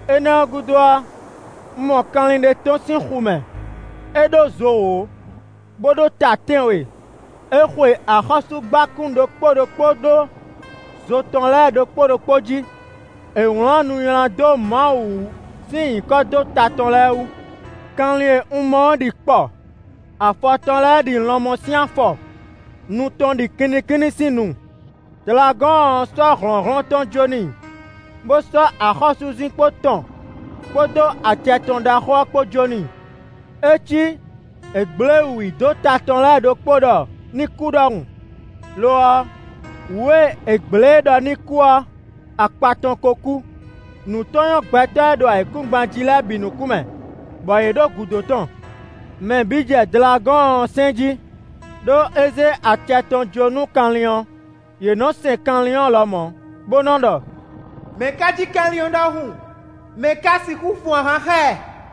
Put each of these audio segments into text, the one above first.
Énɛ́ ɔ́ gúdo ɔ́, un mɔ kanlin ɖé tɔ́n sín xu mɛ; é ɖó zo wǒ, bó ɖó ta tɛ́nwe; é xwe axɔ́súgbákún ɖokpó ɖokpó ɖó zo tɔn lɛ́ɛ ɖokpó ɖokpó jí; è wlǎn nu nylá dó Mawu wú sín nyǐkɔ dó ta tɔn lɛ́ɛ wú. Kanlin e un mɔ ɔ́ ɖi kpɔ; afɔ tɔn lɛ́ɛ ɖi lɔnmɔ sín afɔ; nu tɔn ɖi kinnikínní sín nu. Dlagɔ́ɔn ɔ́ sɔ́ hlɔ̌nhlɔ́n tɔn jó n'i, bó sɔ́ axɔ́súzinkpo tɔn kpódó acɛ tɔn ɖaxó ɔ́ kpó jó n'i. É cí è gblě wǔ i dó ta tɔn lɛ́ɛ ɖokpó ɖɔ ní kú ɖɔhun; lo ɔ́, wǔ e è gblě e ɖɔ ní kú ɔ́, akpa tɔn ko kú. Nǔ tɔn nyɔ́ gbɛtɔ́ e ɖo ayǐkúngban jí lɛ́ɛ bǐ nukún mɛ, bɔ yě ɖo gǔdo tɔn. Mɛ bǐ jɛ Dlagɔ́ɔn ɔ́ sɛn jí, ɖó é zé acɛ tɔn jó nú kanlin ɔ́; yě nɔ sɛn kanlin ɔ́ lɔmɔ̌, bó nɔ ɖɔ: “Mɛ̌ ká cí kanlin ɔ́ ɖɔhun? Mɛ̌ ká sixú fun ahwan xá ɛ?”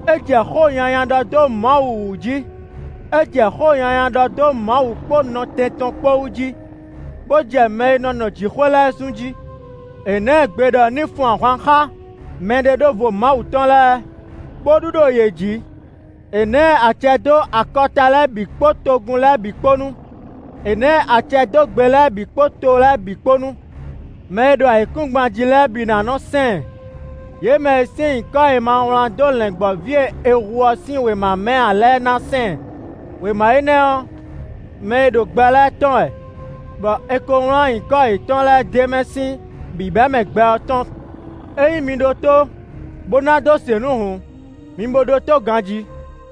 É jɛ xó nyanya ɖɔ dó Mawu wǔ jí; é jɛ xó nyanya ɖɔ dó Mawu kpó nɔtɛn tɔn kpó wú jí, bó jɛ mɛ e nɔ nɔ jǐxwé lɛ́ɛ zun jí. È ná ɛ gbe ɖɔ ní fun ahwan xá mɛɖeɖóvo Mawu tɔn lɛ́ɛ, bó ɖu ɖo yě jǐ; è ná ɛ acɛ dó akɔta lɛ́ɛ bǐ kpó togun lɛ́ɛ bǐ kpó nu; é ná ɛ acɛ dó gbe lɛ́ɛ bǐ kpó to lɛ́ɛ bǐ kpó nu. Mɛ e ɖo ayǐkúngban jí lɛ́ɛ bǐ ná nɔ sɛn ɛ: yě mɛ e sín nyǐkɔ è ma wlán dó Lɛ̌ngbɔ́ví e è hu ɔ́ sín wěma mɛ ǎ lɛ́ɛ ná sɛn ɛ. Wěma énɛ́ ɔ́, mɛ e ɖo gbɛ lɛ́ɛ tɔn wɛ, bɔ è ko wlán nyǐkɔ yětɔn lɛ́ɛ d'é mɛ sín bǐbɛ́mɛ gbɛ ɔ́ tɔn. “Ényí mi ɖó tó bó ná dó se nǔ hǔn, mi bo ɖótó ganjí.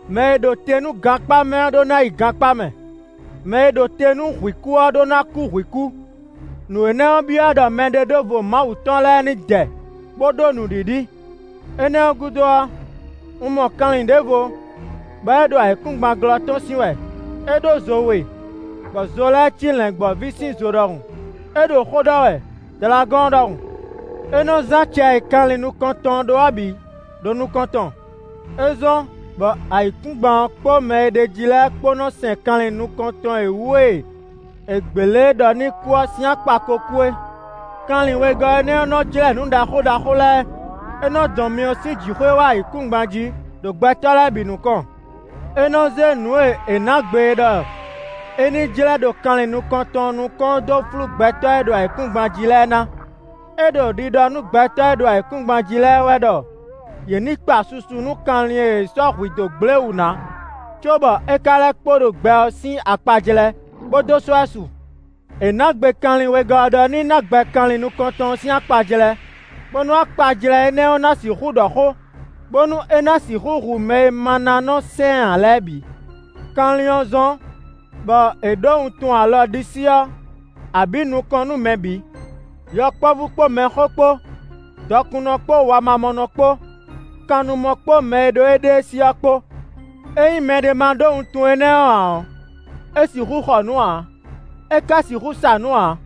Mɛ e ɖo te nú gankpá mɛ ɔ́ ɖó ná yi gankpá mɛ; mɛ e ɖo te nú hwǐ kú ɔ́ ɖó ná kú hwǐ kú; nǔ énɛ́ ɔ́ byɔ́ ɖɔ mɛɖeɖóvo Mawu tɔn lɛ́ɛ ní dɛ, bó ɖó nǔɖiɖi.” Énɛ́ ɔ́ gúdo ɔ́, un mɔ kanlin ɖěvo bɔ é ɖo ayǐkúngban glɔ́ tɔ́n sín wɛ; é ɖó zo we, bɔ zo lɛ́ɛ cí Lɛ̌ngbɔ́ví sín zo ɖɔhun; é ɖo xó ɖɔ wɛ Dlagɔ́ɔn ɖɔhun. É nɔ zán acɛ e kanlin nukɔntɔn ɔ́ ɖó ɔ́ bǐ ɖo nukɔn tɔn. É zɔ́n bɔ ayǐkúngban ɔ́ kpó mɛ e ɖ'é jí lɛ́ɛ kpó nɔ sɛn kanlin nukɔntɔn e wǔ e è gblě e ɖɔ ní kú ɔ́ sín akpa ko kú é. Kanlin wegɔ́ énɛ́ ɔ́, nɔ jlɛ́ nǔ ɖaxó ɖaxó lɛ́ɛ; é nɔ dɔn myɔ sín jǐxwé wá ayǐkúngban jí ɖo gbɛtɔ́ lɛ́ɛ bǐ nukɔn. É nɔ zé nǔ e è nǎ gbe e ɖɔ é ní jlɛ́ ɖo kanlin nukɔntɔn ɔ́ nukɔn ɔ́ dó flú gbɛtɔ́ e ɖo ayǐkúngban jí lɛ́ɛ ná. É ɖo ɖiɖɔ nú gbɛtɔ́ e ɖo ayǐkúngban jí lɛ́ɛ wɛ ɖɔ yě ní kpa susu nú kanlin e è sɔ́ hwǐ dó gblé wǔ ná, cóbɔ é ka lɛ́ kpo ɖo gbɛ ɔ́ sín akpajlɛ́, bó dó sɔ́ ɛ su. È nǎ gbe kanlin wegɔ́ ɔ́ ɖɔ ní ná gbɛ kanlin nukɔntɔn ɔ́ sín akpajlɛ́, bónú akpajlɛ́ énɛ́ ɔ́ ná sixú ɖɔ xó, bónú é ná sixú hu mɛ e ma ná nɔ sɛn ɛ ǎ lɛ́ɛ bǐ. Kanlin ɔ́ zɔ́n bɔ è ɖǒ wuntun alɔ ɖisí ɔ́, abǐ nukɔn nú mɛ bǐ: yɔkpɔ́vú kpó mɛxó kpó; dɔkunnɔ kpó wamamɔnɔ kpó; kannumɔ kpó mɛ e ɖo éɖée sí ɔ́ kpó. Ényí mɛɖé ma ɖó wuntun énɛ́ ɔ́ ǎ ɔ́, é sixú xɔ nǔ ǎ; é ka sixú sa nǔ ǎ.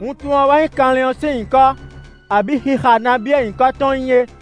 Wuntun ɔ́ wɛ nyí kanlin ɔ́ sín nyǐkɔ, abǐ xixa nabí e nyǐkɔ tɔn nyí é.